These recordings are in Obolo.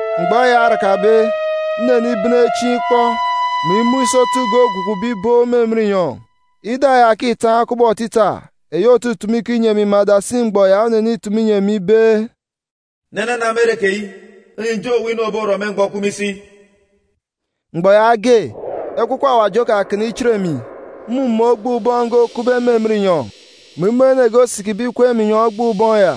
Mgbọ eya orakabe, nnenibene chieen̄ ikpọ, mè imun̄ isotu ge ogwukube ibook me emen inyọn̄. Ida ya òkitaan̄ kubọk otita, eyi òtutumu ikọ inyi emi me adasi mgbọ ya onenitumu inyi emi ibe, “Nene na me ere keyi, inyi ǹjeen̄ owu inu òborọ me mgbọ òkup me isi.” Mgbọ yaage, Ekwukwu Awaji okakana ichit emi, mmumun̄ ogboon̄ ubọọn̄ ge okupbe me emen inyọn̄, mè imun̄ ene ge osikibe ikweek me inyọn̄ ogboon̄ ubọọn̄ ya.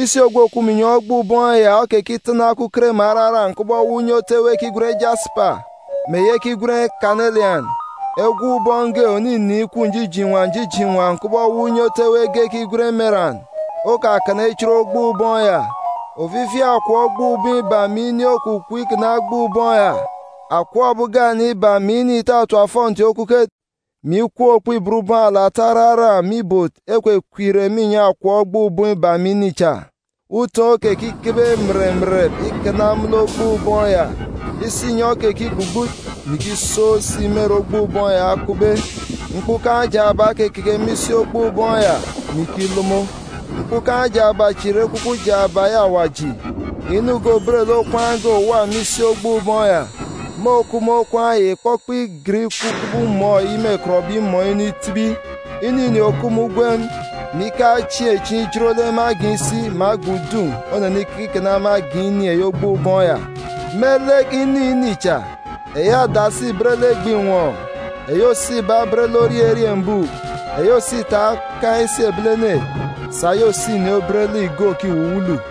Isi ogwu òkup me inyọn̄ ogboon̄ ubọọn̄ ya okekitana okuket mè araran̄ kubọk ewuuk unye otu ewe ekigwen jasipa, mè eyi ekigwen kanelian. Egop ubọọn̄ ge òninin̄ ikup njijoon̄ inwan̄ njijoon̄ inwan̄ kubọk ewuuk unye otu ewe ekigwen emeran, okakana ichit ogboon̄ ubọọn̄ ya. Ofifi akọp ogboon̄ ubọọn̄ iba mè ini okukup ikana ogboon̄ ubọọn̄ ya. Akọp ebi ugane iba mè ini ìtatap ofọnti okuket, mè ikwuun̄ okpibot ubọọn̄ alata araran̄ me ibot ekwekweek irek me inyọn̄ akọp ogboon̄ ubọọn̄ iba mè ini cha. Utoon̄ okekikebe mèrèmèrèp ikana me lek ogboon̄ ubọọn̄ ya. Isinyọn̄ okekigbugbut, mè ikisook si me ere ogboon̄ ubọọn̄ ya okupbe. Mkpukan̄ jaaba okekeke me isi ogboon̄ ubọọn̄ ya, mè ikilomo. Mkpukan̄ jaaba chi ìre ekwukwu jaaba eyi Awaji. Inu ge òbet lek okwaan̄ òwa me isi ogboon̄ ubọọn̄ ya. Mun̄ òkup me okwaan̄ ya ìkpọkpọ igen ikup kubọk umọọn̄ eyi mêkọtbe imọọn̄ inu itibi. Inu ini òkup me ugwem, mè ikaan̄ chieen̄ chieen̄ ijot lek me agan̄ isi, mè agan̄ udun̄ onenikeke ikana me agan̄ ini eyi ogboon̄ ubọọn̄ ya. Me lek inu ini cha, eyi adasi ìbet lek egbe àtat, eyi òso iba obet lek orie eriembuuk, eyi òso ita okaan̄ isi ebilene, sà eyi òso ini obet lek igo òkiwuwulu.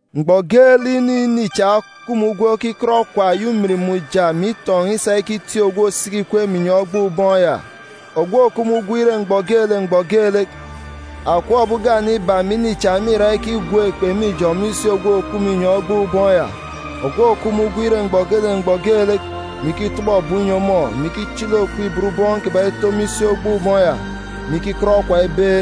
Mgbọ geelek inu ini cha òkup me ugwem ekikọt okwa eyi ujamgbugbo mè itọn̄ isa ikitik ogwu òsisiki ikweek me inyọn̄ ogboon̄ ubọọn̄ ya, ogwu òkup me ugwem ire mgbọ geelek mgbọ geelek, akọp ebi ugane iba mè ini cha mîra ikigwook ekpe me ijọn̄ me isi ogwu òkup me inyọn̄ ogboon̄ ubọọn̄ ya, ogwu òkup me ugwem ire mgbọ geelek mgbọ geelek, mè ikitọbọ ebum inyi ọmọ, mè ikichili okpibot ubọọn̄ kiban̄ ito me isi ogboon̄ ubọọn̄ ya, mè ikikọt okwa ibe,